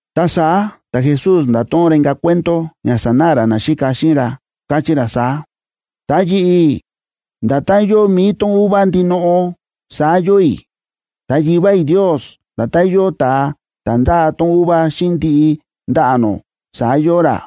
Ta saá ta̱Jesús nda̱to̱ꞌon ra inka̱ cuento ña sanáꞌa ra naxíka xíꞌin ra, káchí ra saá: ―Ta yi̱ꞌi̱, nda̱tán yóo mi̱i tón uva ndinoꞌo, saá yóo i̱. Ta Yivá i̱ Ndios nda̱tán yóo ta̱a ta̱ ndáa tón uva xíꞌin ndiꞌi ndaꞌa̱ nó, saá yóo ra.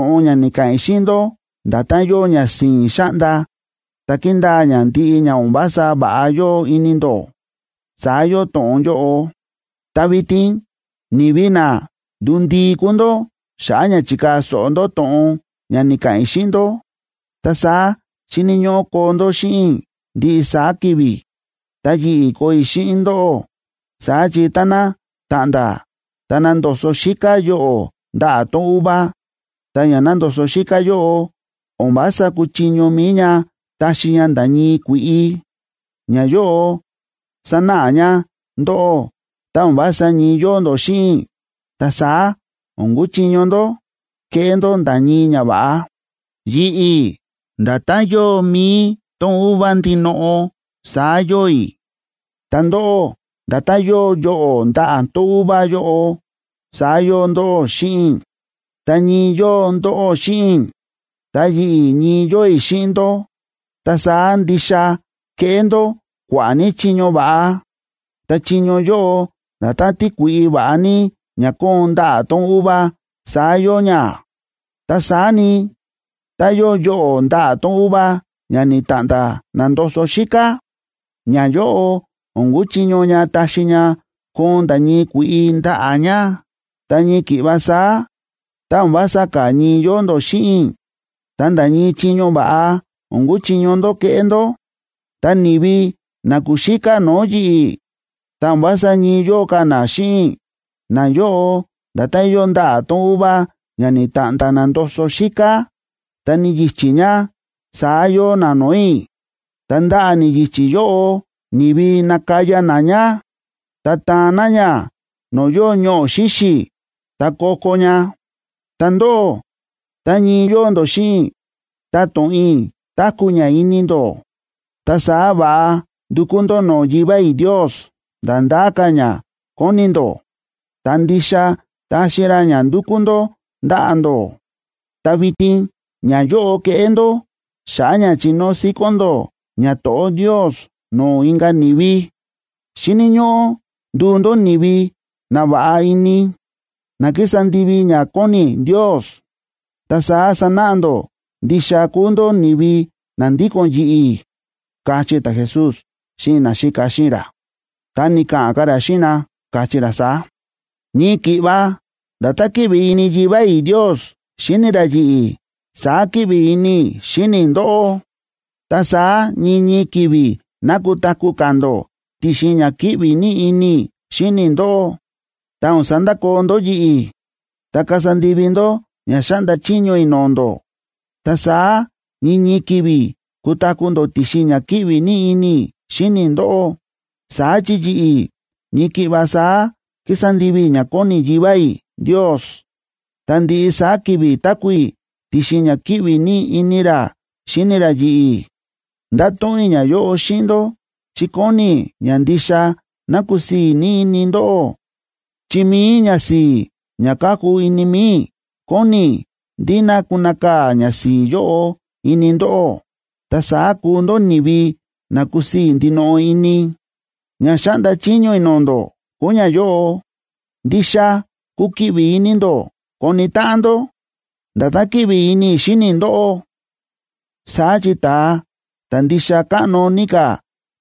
Ta to̱ꞌon ña ni̱ka̱ꞌa̱n i̱ xíꞌin ndó, nda̱tán yóo ña si̱i̱n xáꞌnda, ta kindaa ña ndiꞌi ña o̱n vása va̱ꞌa yóo ini ndó, saá yóo to̱ꞌon yóꞌo. Ta vitin ni̱vi na ndu̱ndii kúu ndó xa̱ꞌa̱ ña chi̱kaa̱ so̱ꞌo ndó to̱ꞌon ña ni̱ka̱ꞌa̱n i̱ xíꞌin ndó. Ta saá xíni̱ ñóꞌó koo ndó xíꞌin i̱ ndiꞌi saá ki̱vi̱, ta yi̱ꞌi̱ koo i̱ xíꞌin ndóꞌó. Saá chi táná ta̱ꞌnda̱, ta na̱ndoso xíká yoꞌo̱ ndaꞌa̱ tón uva, ta ña na̱ndoso xíká yóꞌo, o̱n vása kúchiño mi̱i ña taxi ña nda̱ ñii kui̱ꞌi. Ñayóꞌo sánáꞌa ña ndóꞌó tá o̱n vása ñii yóo ndó xíꞌin i̱, ta saá o̱n kuchiño ndó keꞌé ndó nda̱ ñii ñava̱ꞌa. ’Yi̱ꞌi̱, nda̱tán yóo mi̱i tón uva ndinoꞌo saá yóo i̱, ta ndóꞌó, nda̱tán yóo yoꞌo̱ ndaꞌa̱ tón uva yóꞌo, saá yóo ndóꞌó xíꞌin i̱. Tá ñii yóo ndóꞌó xíꞌin i̱, ta yi̱ꞌi̱, ñii yóo i̱ xíꞌin ndó, ta saá ndixa kéꞌé ndó kua̱ꞌa̱ ní chiño va̱ꞌa. Ta chiño yóꞌo nda̱tán tíkui̱ꞌi va̱ꞌa ní ña kóon ndaꞌa̱ tón uva saá yóo ña. Ta saá ni, tá yóo yoꞌo̱ ndaꞌa̱ tón uva ña ni̱ta̱ꞌnda̱ na̱ndoso xíká, ñayóꞌo o̱n kuchiño ña taxi ña koon nda̱ ñii kui̱ꞌi ndaꞌa̱ ña. Ta ñii ki̱ꞌva saá, tá o̱n vása ka̱ ñii yóo ndó xíꞌin i̱, ta nda̱ ñii chiño va̱ꞌa o̱n kuchiño ndó keꞌé ndó. Ta ni̱vi na kúxíká no̱o̱ yi̱ꞌi̱, ta o̱n vása ñii yóo ka̱ na xíꞌin i̱, nayóꞌo nda̱tán yóo ndaꞌa̱ tón uva ña ni̱ta̱ꞌnda̱ na̱ndoso xíká ta ni̱yichí ña, saá yóo na no̱o̱ i̱. Ta ndaꞌa̱ ni̱yichí yóꞌo, ni̱vi nakaya na ña, ta taan na ña no̱o̱ yóo ñoꞌo̱ xíxi̱, ta ko̱ko̱ ña. ’Ta ndóꞌó, tá ñii yóo ndó xíꞌin i̱, ta to̱ꞌon i̱ táku̱ ña ini ndó, ta saá va̱ꞌa ndukú ndó no̱o̱ Yivá i̱ Ndios nda̱ ndá ka̱ ña kóni ndó, ta ndixa taxi ra ña ndúkú ndó ndaꞌa̱ ndó. Ta vitin ñayóꞌo keꞌé ndó xa̱ꞌa̱ ña chinóo síkón ndó ñato̱ꞌó Ndios no̱o̱ inka̱ ni̱vi: Xíni̱ ñóꞌó nduu ndó ni̱vi na va̱ꞌa ini, na kísa ndivi ña kóni Ndios, ta saá sanáꞌa ndó ndixa kúu ndó ni̱vi na ndíko̱n yi̱ꞌi̱ ―káchí ta̱Jesús xíꞌin naxíka xíꞌin ra. Ta ni̱ka̱ꞌa̱n ka̱ ra xíꞌin na, káchí ra saá: ―Ñii ki̱ꞌva nda̱tán kíꞌvi ini Yivá i̱ Ndios xíni ra yi̱ꞌi̱, saá kíꞌvi ini i̱ xíni i̱ ndóꞌó. Ta saá ñii ñii ki̱vi̱ ná kutaku̱ ka̱ ndó ti̱xin ña kíꞌvi ní ini i̱ xíni i̱ ndóꞌó, ta o̱n sandakoo ndó yi̱ꞌi̱. Tá kasa ndivi ndó ña xáꞌnda chiño i̱ no̱o̱ ndó, ta saá ñii ñii ki̱vi̱ kutaku̱ ndó ti̱xin ña kíꞌvi ní ini i̱ xíni i̱ ndóꞌó. Saá chi yi̱ꞌi̱, ñii ki̱ꞌva saá kísa ndivi i̱ ña kóni Yivá i̱ Ndios, ta ndiꞌi saá ki̱vi̱ táku̱ i̱ ti̱xin ña kíꞌvi ní ini ra xíni ra yi̱ꞌi̱. ’Nda̱to̱ꞌon i̱ ñayóꞌo xíꞌin ndó chi kóni i̱ ña ndixa ná kusii̱ ní ini ndóꞌó. Chi mi̱i ñasi̱i̱ ña káku ini mi̱i i̱, kóni i̱ ndí ná kunakaa̱ ñasi̱i̱ yóꞌo ini ndóꞌó, ta saá kuu ndó ni̱vi na kusii̱ ndinoꞌo ini. Ña xáꞌnda chiño i̱ no̱o̱ ndó kúu ñayóꞌo: Ndixa kukiꞌvi ini ndó koni táꞌan ndó, nda̱tán kíꞌvi ini i̱ xíni i̱ ndóꞌó. Saá chi ta̱a ta̱ ndixa káꞌno ní ka̱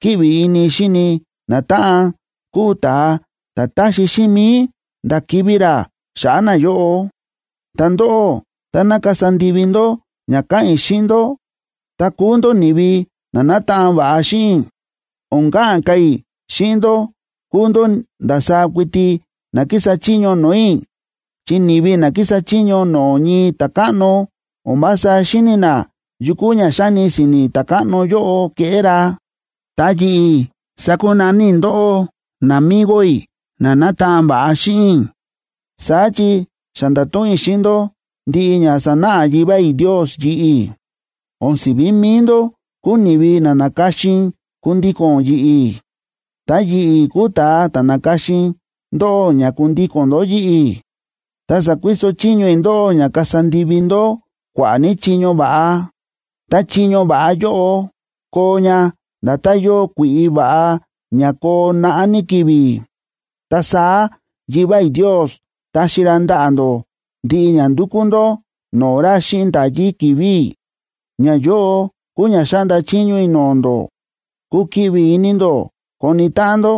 kíꞌvi ini xíni natáꞌan kúu ta̱a ta̱ táxi xíꞌin mi̱i nda̱ kivi̱ ra xa̱ꞌa̱ nayóꞌo. Ta ndóꞌó, táná kasa ndivi ndó ña káꞌa̱n i̱ xíꞌin ndó, ta kuu ndó ni̱vi na nátaꞌan va̱ꞌa xíꞌin i̱. O̱n ka̱ꞌa̱n ka̱ i̱ xíꞌin ndó kúu ndó ndasaá kuiti na kísa chiño no̱o̱ i̱, chi ni̱vi na kísa chiño no̱o̱ ñii ta̱káꞌno o̱n vása xíni̱ na yu kúu ña xáni si̱ni̱ ta̱káꞌno yóꞌo keꞌé ra. Ta yi̱ꞌi̱ sa̱kunaní i̱ ndóꞌó namigo i̱ na nátaꞌan va̱ꞌa xíꞌin i̱, saá chi xa nda̱to̱ꞌon i̱ xíꞌin ndó ndiꞌi ña sa̱náꞌa Yivá i̱ Ndios yi̱ꞌi̱. O̱n si̱ví mi̱i ndó kúu ni̱vi na na̱ka̱xin kundíko̱n ndó yi̱ꞌi̱, ta yi̱ꞌi̱ kúu ta̱a ta̱ na̱ka̱xin i̱ ndóꞌó ña kundíko̱n ndó yi̱ꞌi̱, ta sa̱kuiso chiño i̱ ndóꞌó ña kasa ndivi ndó kua̱ꞌa̱ ní chiño va̱ꞌa. Ta chiño va̱ꞌa yóꞌo koo ña nda̱tán yóo kui̱ꞌi va̱ꞌa ña koo naꞌá ní ki̱vi̱. Ta saá Yivá i̱ Ndios taxi ra ndaꞌa̱ ndó ndiꞌi ña ndúkú ndó no̱o̱ ra xíꞌin nda̱yí ki̱vi̱ i̱. Ñayóꞌo kúu ña xáꞌnda chiño i̱ no̱o̱ ndó: Kukiꞌvi ini ndó koni táꞌan ndó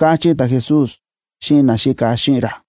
―káchí ta̱Jesús xíꞌin naxíka xíꞌin ra.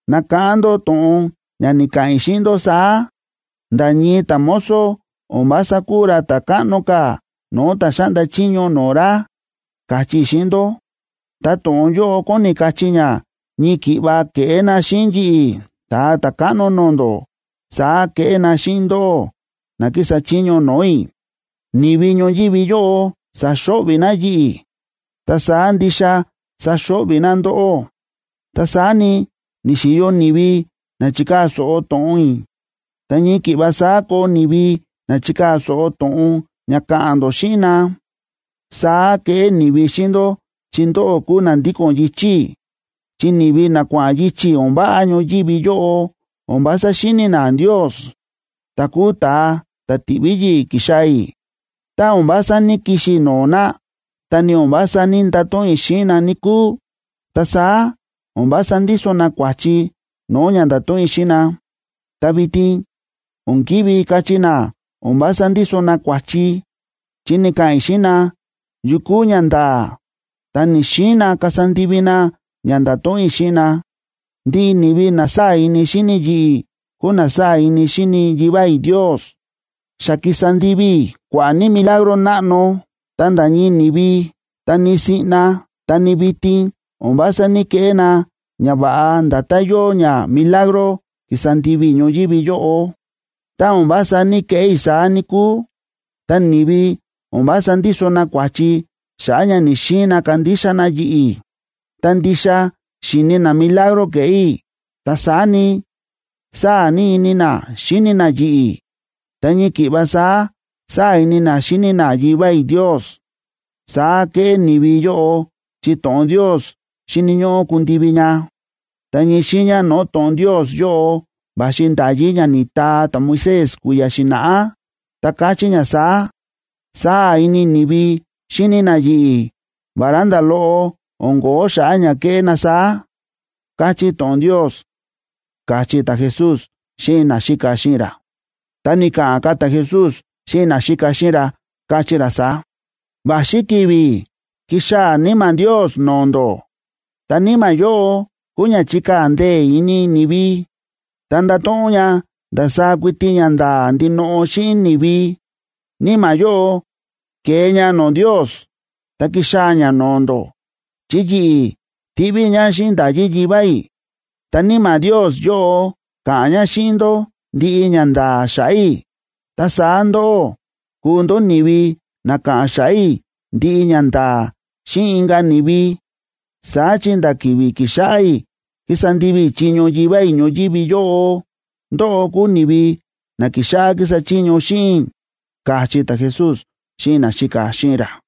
Nakáꞌán ndó to̱ꞌon ña ni̱ka̱ꞌa̱n i̱ xíꞌin ndó saá: “Nda̱ ñii ta̱mozo o̱n vása kúu ra ta̱ káꞌno ka̱ no̱o̱ ta̱ xáꞌnda chiño no̱o̱ ra”, káchí i̱ xíꞌin ndó. Ta to̱ꞌon yóꞌo kóni kachí ña ñii ki̱ꞌva kéꞌé na xíꞌin yi̱ꞌi̱, Ta̱a Ta̱káꞌno no̱o̱ ndó, saá keꞌé na xíꞌin ndóꞌó na kísa chiño no̱o̱ i̱. Ni̱vi ñoyívi yóꞌo sa̱xo̱ꞌvi̱ na yi̱ꞌi̱, ta saá ndixa saxo̱ꞌvi̱ na ndóꞌó. Ta saá ni, ni̱xi̱yo ni̱vi na chi̱kaa̱ so̱ꞌo to̱ꞌon i̱, ta ñii ki̱ꞌva saá koo ni̱vi na chikaa̱ so̱ꞌo to̱ꞌon ña ka̱ꞌa̱n ndó xíꞌin na. Saá keꞌé ni̱vi xíꞌin ndó chi ndóꞌó kúu na ndíko̱n yichi̱ i̱. Chi ni̱vi na kua̱ꞌa̱n yichi̱ o̱n váꞌa ñoyívi yóꞌo o̱n vása xíni̱ na Ndios, ta̱ kúu ta̱a ta̱ ti̱ꞌví yi̱ꞌi̱ ki̱xaa̱ i̱. ’Tá o̱n vása ní‑kixi i̱ no̱o̱ na, tá ni o̱n vása ní‑ndato̱ꞌon i̱ xíꞌin na, níkúu, ta saá o̱n vása ndíso na kua̱chi no̱o̱ ña nda̱to̱ꞌon i̱ xíꞌin na. Ta vitin o̱n ki̱ví kachí na o̱n vása ndíso na kua̱chi, chi ni̱ka̱ꞌa̱n i̱ xíꞌin na yu kúu ñanda̱a̱, ta ni̱‑xiin na kasa ndivi na ña nda̱to̱ꞌon i̱ xíꞌin na. Ndiꞌi ni̱vi na sáa̱ ini xíni yi̱ꞌi̱ kúu na sáa̱ ini xíni Yivá i̱ Ndios. Xa ki̱sa ndivi i̱ kua̱ꞌa̱ ní milagro náꞌno, ta nda̱ ñii ni̱vi, ta ni siꞌna ta ni vitin, o̱n vása ní‑keꞌé na ñava̱ꞌa nda̱tán yóo ña milagro ki̱sa ndivi i̱ ñoyívi yóꞌo. Tá o̱n vása ní‑keꞌé i̱ saá, níkúu, ta ni̱vi o̱n vása ndíso na kua̱chi xa̱ꞌa̱ ña ni̱‑xiin na kandixa na yi̱ꞌi̱. Ta ndixa xi̱ni na milagro ke̱ꞌé i̱, ta saá ni, sáa̱ ní ini na xíni na yi̱ꞌi̱, ta ñii ki̱ꞌva saá, saá ini na xíni na Yivá i̱ Ndios. Saá kéꞌé ni̱vi yóꞌo chi to̱ꞌon Ndios xíni̱ ñóꞌó kundivi ña. Ta ñii xiiña no̱o̱ to̱ꞌon Ndios yóꞌo va̱xi nda̱yí ña ni̱taa ta̱Moisés kui̱ya̱ xi̱na̱ꞌá, ta káchí ña saá: “Sáa̱ ini ni̱vi xíni na yi̱ꞌi̱, vará nda̱ loꞌo o̱n ko̱ó xa̱ꞌa̱ ña kéꞌé na saá”, káchí to̱ꞌon Ndios ―káchí ta̱Jesús xíꞌin naxíka xíꞌin ra. Ta ni̱ka̱ꞌa̱n ka̱ ta̱Jesús xíꞌin naxíka xíꞌin ra, káchí ra saá: ―Va̱xi ki̱vi̱ kixaa̱ Níma̱ Ndios no̱o̱ ndó, ta Níma̱ yóꞌo kúu ña chíkaa̱ ndee̱ ini ni̱vi, ta ndáto̱ꞌon ña ndasaá kuiti ñanda̱a̱ ndinoꞌo xíꞌin ni̱vi. Níma̱ yóꞌo kee ña no̱o̱ Ndios ta kixaa̱ ña no̱o̱ ndó, chi yi̱ꞌi̱ tiꞌví i̱ ña xíꞌin nda̱yí Yivá i̱, ta Níma̱ Ndios yóꞌo ka̱ꞌa̱n ña xíꞌin ndó ndiꞌi ñanda̱a̱ xa̱ꞌa̱ i̱. Ta saá ndóꞌó kuu ndó ni̱vi na ka̱ꞌa̱n xa̱ꞌa̱ i̱ ndiꞌi ñanda̱a̱ xíꞌin inka̱ ni̱vi, saá chi nda̱ ki̱vi̱ ki̱xáꞌá i̱ kísa ndivi i̱ chiño Yivá i̱ ñoyívi yóꞌo, ndóꞌó kúu ni̱vi na ki̱xáꞌá kísa chiño xíꞌin i̱ ―káchí ta̱Jesús xíꞌin naxíka xíꞌin ra.